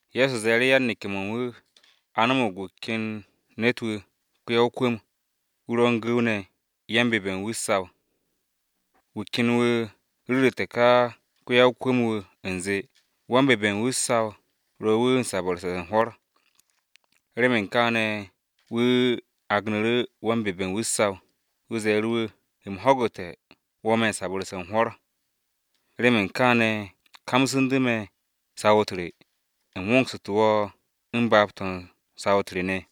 Ye̱so ze̱e̱ru̱ yan-neke̱-mo̱ u̱n wu̱, “A no̱mo̱g wu̱ ken ne̱t-wu̱ ko-ya-o-kwu̱m, wu̱ ro̱ u̱n ko-gu̱w ne̱ wan-bebe̱ u̱n wu̱ u̱t-saw. Wu̱ ken wu̱ ru̱ru̱te̱ ka ko-ya-o-kwu̱m-wu̱ u̱nze wan-bebe̱ u̱n wu̱ u̱t-saw ro̱ wu̱ u̱n sabu̱rse̱ u̱n hwo̱r. Remen kaane̱ wu̱ agnu̱ru̱ wan-bebe̱ u̱n wu̱ u̱t-saw. Wu̱ ze̱e̱ru̱ wu̱, ‘U̱m ho̱gu̱te̱ wo̱ me̱ m-sabu̱rse̱ u̱n hwo̱r. Remen kaane̱ kamsu̱ndu̱ me̱ saw-u̱t re, u̱m wongsu̱te̱ wo̱ u̱n baab-to̱ u̱n saw-u̱t re ne̱.’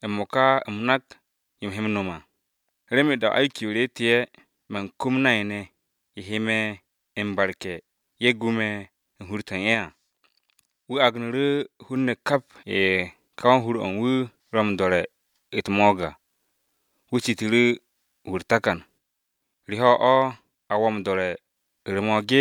M-mo̱ka u̱m nak yo u̱m he no̱m à! Remen da-o̱ se̱nge̱-m re te'e̱, man kum nay-ne̱, ye̱ he me̱ m-barke̱ ye̱ gu me̱ u̱n hur-to̱ u̱n ye̱ à.’ “Wu̱ agnu̱ru̱ hun-ne̱ kap ye̱ ka wan-hur-o̱ u̱n wu̱ ro̱ m-do̱re̱ u̱t-mo̱o̱g à. Wu̱ citu̱ru̱ wu̱ u̱r-takan. ‘¿Re ho̱ o̱ a wo̱ m-do̱re̱ u̱r-mo̱o̱g?’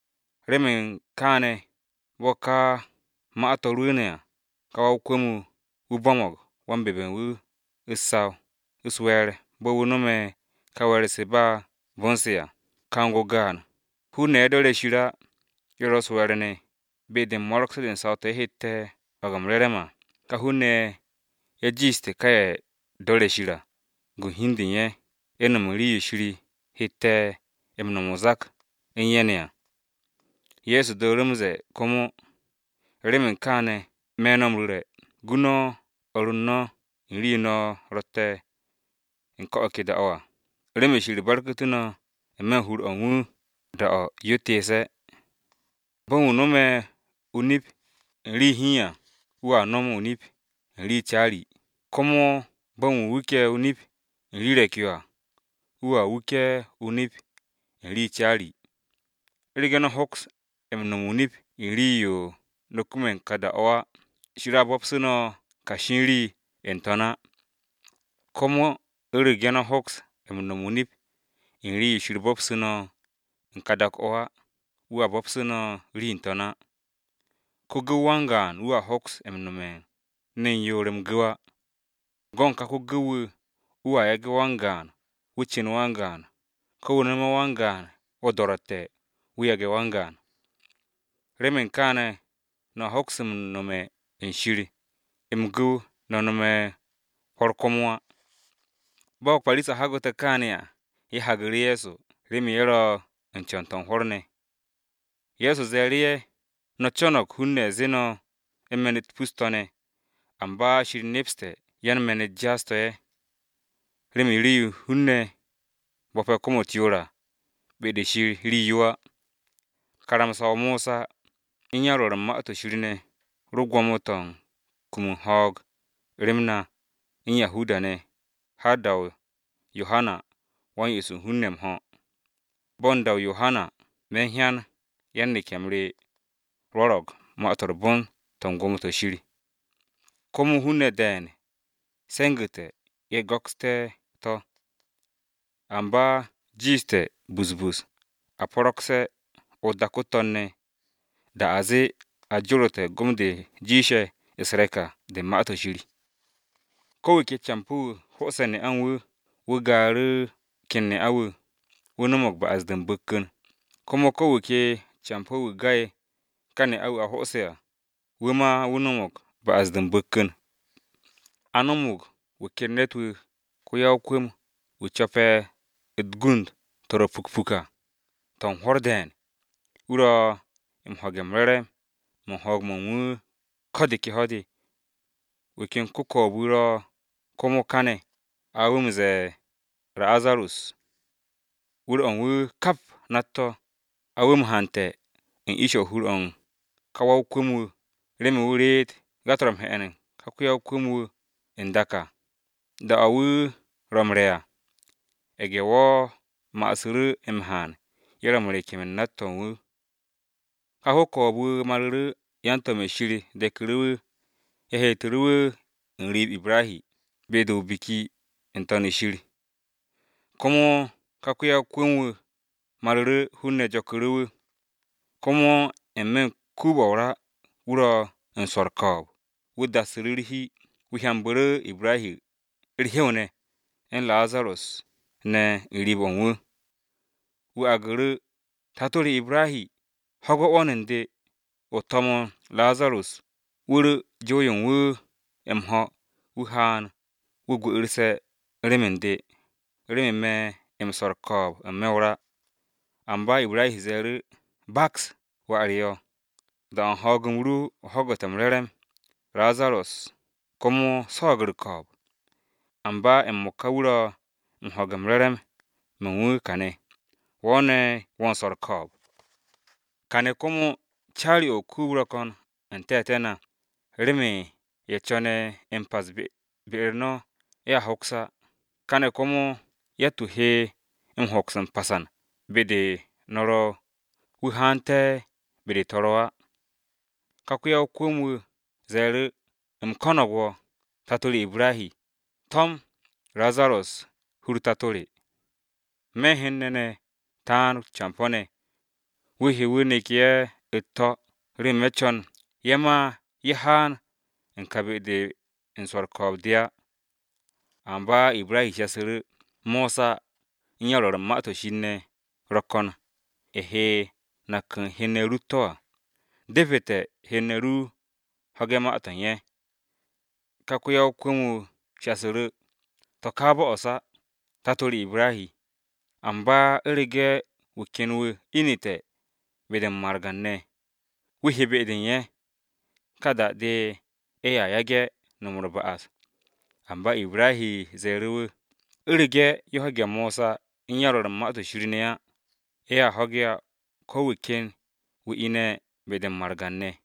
“Remen kaane̱ bo̱ ka ma-to̱ rwu̱u̱ne̱ à, ka wa-o-kwu̱m, wu̱ bo̱mo̱g wan-bebe̱ u̱n wu̱ u̱t-saw u̱s-we̱e̱r bo̱ wu̱ no̱me̱ ka we̱e̱r-se ba u̱r-bon se̱ à. Kang-o gaan, hun-ne̱ ye̱ do̱re̱ Shir á, ye̱ ro̱ u̱s-we̱e̱r ne̱ be-de u̱n mo̱ro̱gse̱ u̱t-saw to̱ ye̱ hette̱ ho̱ge̱ m-re̱re̱m à, ka hun-ne̱ ye̱ jiishte̱ ka ye̱ do̱re̱ Shir à, gun hi u̱n de u̱n ye̱, u̱n no̱m u̱n rii-yo Shir hette̱ m-no̱m o-zak u̱n ye̱ ne̱ à.” Ye̱so dooru̱ m-ze̱e̱ komo, “Remen kaane̱ me̱ no̱ m-ru̱re̱, gu no̱ o̱r u̱n no̱ u̱n rii-yo no̱ ro̱tte̱ u̱n ka dak-o̱ à, remen Shir barku̱tu̱ no̱ n-me̱ u̱n hur-o̱ u̱n wu̱, da-o̱ yo teese̱ à. Bo̱ u̱n wu̱ no̱me̱ o-nip u̱n rii hiin à, wu̱a no̱m o-nip u̱n rii caari, komo bo̱ u̱n wu̱ wuke̱ o-nip u̱n rii re̱k-yo à, wu̱a wuke̱ o-nip u̱n rii caari. U̱rege̱, no̱ hoks m-no̱m o-nip u̱n rii-yo no̱ kume̱ u̱n ka dak-o̱ á, Shir a bo̱psu̱ no̱ kashi u̱n rii n-To̱n á. Komo u̱rege̱ no̱ hoks m-no̱m o-nip u̱n rii-yo Shir bo̱psu̱ no̱ u̱n ka dak-o̱ á, wu̱a bo̱psu̱ no̱ rii n-To̱n á. “Ko-gu̱w wan-gaan wu̱a hoks nome̱ u̱n ne̱n yoor m-gu̱w á. Go̱ u̱n ka ko-gu̱w wu̱a yage̱ wan-gaan, wu̱ cu̱n wan-gaan, ko wu̱ nome̱ wan-gaan o-do̱ro̱tte̱ wu̱ yage̱ wan-gaan. Remen kaane̱ no̱a hoks m-nome̱ u̱n Shir m-gu̱w no̱ nome̱ hwo̱r komo á.” Bo̱ Parisa-ne̱ ho̱gu̱te̱ kaane̱ à, ye̱ hagu̱ru̱ Ye̱so remen ye̱ ro̱ u̱n co̱n-to̱ u̱n hwo̱r ne̱. Ye̱so ze̱e̱ru̱ ye̱, “No̱ co̱no̱g hun-ne̱ zee no̱ u̱n me̱n-u̱t pus-to̱ ne̱, amba Shir nepse̱ no̱ yan-me̱n-u̱t jaas-to̱ ye̱. Remen rii-yo hun-ne̱ bo̱pe̱ kom-u̱t yoor à, be-de u̱n Shir rii-yo á. “Karamsa-o Mosa u̱n yan-Rwo̱r u̱n Ma-to̱ Shir ne̱ ro gwo̱mo-to̱ u̱n kumu u̱n ho̱o̱g rem na u̱n Yahuda-ne̱ har da-o Yohana Wa-m-Yo'os u̱n hun-ne̱ m-ho̱. Bo̱ u̱n da-o Yohana, me̱ u̱n yan-neke̱-m re ne̱ rwo̱ro̱g, Ma-to̱ m-Re̱re̱m to̱ u̱n gwo̱mo-to̱ Shir. Komo hun-ne̱ de̱e̱n se̱ngu̱te̱ ye̱ go̱kste̱ to̱. Amba jiishte̱ busbus a po̱ro̱gse̱ o-dak o-To̱n ne̱, da a zee a jorote̱ gom-de jiishe̱ u̱s-re̱k à, de u̱n karamsa-o̱ Shir. “Ko̱ wu̱ ke campo̱ wu̱, ho'ose̱ ne'a u̱n wu̱, wu̱ gaaru̱ wu̱ ken ne'a-wu̱, wu̱ no̱mo̱g ba'as-de u̱n m-bu̱kku̱n, komo ko̱ wu̱ ke campo̱-wu̱ ga'e̱ ka ne'a-wu̱ a ho'ose̱ à, wu̱ ma wu̱ no̱mo̱g ba'as-de u̱n m-bu̱kku̱n. “A no̱mo̱g wu̱ ken ne̱t-wu̱ ko-ya-o-kwu̱m, wu̱ co̱pe̱ u̱t-gund to̱ ro̱ pukpuk à to̱ u̱n hwo̱r de̱e̱n, wu̱ ro̱ m-ho̱ge̱ re̱re̱m-mo̱ ho̱o̱g-mo̱ u̱n wu̱ ko̱ de ke ho̱-de. Wu̱ ken ko-ko̱o̱b-wu̱ ro komo káne̱, a wu̱ m-ze̱e̱ Razarus. Wu̱r-o̱ u̱n wu̱ kap nat-to̱, a wu̱ m-hante̱ u̱n ish-o̱ hur-o̱ u̱n ka wa-o-kwu̱m-wu̱, remen wu̱ reet ga-to̱ ro̱ m-he̱'e̱n u̱n ka ko-ya-o-kwu̱m-wu̱ n-dak à, da-o wu̱ ro̱ m-re̱ à. Ye̱ge̱-wo̱ masu̱ru̱ m-haan ye̱ ro̱ m-rekem u̱n nat-to̱ u̱n wu̱. “Ka ko-ko̱o̱b-wu̱ maru̱ru̱, yan-to̱m-ye̱ Shir de̱ku̱ru̱ wu̱ ye̱ heetu̱ru̱ wu̱ n-riib Ibrahi, be-de o-biki n-To̱n u̱n Shir. Komo ka ko-ya-o-kwu̱m-wu̱ maru̱ru̱, hun-ne̱ jo̱ku̱ru̱ wu̱. Komo n-me̱ o-kuub o-ra, wu̱ ro̱ u̱n swo̱ u̱r-ko̱o̱b, wu̱ dassu̱ru̱ u̱r-hi wu̱ hyambu̱ru̱ Ibrahi u̱r-hew ne̱, u̱n Razarus ne̱ u̱n riib-o̱ u̱n wu̱. Wu̱ aagu̱ru̱, ‘Tato re Ibrahi, ho̱ge̱ 'wo̱n u̱n de, o to̱mo̱n Razarus wu̱ ru̱ jow-yo u̱n wu̱ m-ho̱, wu̱ haan, wu̱ gwu̱'u̱rse̱ rem u̱n de, remen me̱ m-swo̱ u̱r-ko̱o̱b n-me̱ o-ra!’ “Amba Ibrahi ze̱e̱ru̱, ‘Baks, wà re o, da-o̱ u̱n ho̱o̱g-m ru o ho̱gu̱te̱ m-re̱re̱m, Razarus komo swo̱o̱g u̱r-ko̱o̱b. Amba m-mo̱ka wu̱ ro̱ m-ho̱ge̱ re̱re̱m-mo̱ u̱n wu̱ káne̱, wo̱ ne̱, wo̱ u̱n swo̱ u̱r-ko̱o̱b. Kane̱ komo, caari-o̱ o-kuub ro̱ ko̱n u̱n te̱te̱ na, remen ye̱ co̱ne̱ m-pas be be-u̱r no̱ ye̱a hoks á, káne̱ komo, yatt-wu̱ he hoks m-passan be-de no̱ ro̱ wu̱ haante̱ be-de te̱ ro̱ á.’ Ka ko-ya-o-kwu̱m-wu̱ ze̱e̱ru̱, ‘U̱m ko̱no̱g wo̱, tato re Ibrahi, to̱m Razarus u̱n hur-o tato re. Me̱ u̱n hen-ne̱ ne̱ taan campo̱-ne̱. Wu̱ he wu̱ nek ye̱ u̱t-to̱ remen me̱ co̱n ye̱ ma ye̱ haan u̱n ka be-de u̱n swo̱ u̱r-ko̱o̱b de á.’ “Amba Ibrahi shasu̱ru̱, ‘Mosa u̱n yan-Rwo̱r u̱n Ma-to̱ Shir ne̱ ro̱ ko̱n ye̱ he nak u̱n hen-ne̱ ru u̱t-to̱ à. Depete̱ hen-ne̱ ru ho̱ge̱ ma-to̱ u̱n ye̱.’ Ka ko-ya-o-kwu̱m-wu̱ shasu̱ru̱, ‘To̱ ka bo'os á, tato re Ibrahi! Amba u̱rege̱ wu̱ ken wu̱ inite̱ be-de u̱n margan-ne̱ wu̱ he be-de u̱n ye̱, ka da-de ye̱a yage̱ no̱m u̱r-ba'as.’ Amba Ibrahi ze̱e̱ru̱ wu̱, ‘U̱rege̱ ye̱ ho̱ge̱ Mosa u̱n yan-Rwo̱r u̱n Ma-to̱ Shir ne̱ á, ye̱a ho̱ge̱ á ko̱ wu̱ ken wu̱ ine̱ be-de u̱n margan-ne̱.’”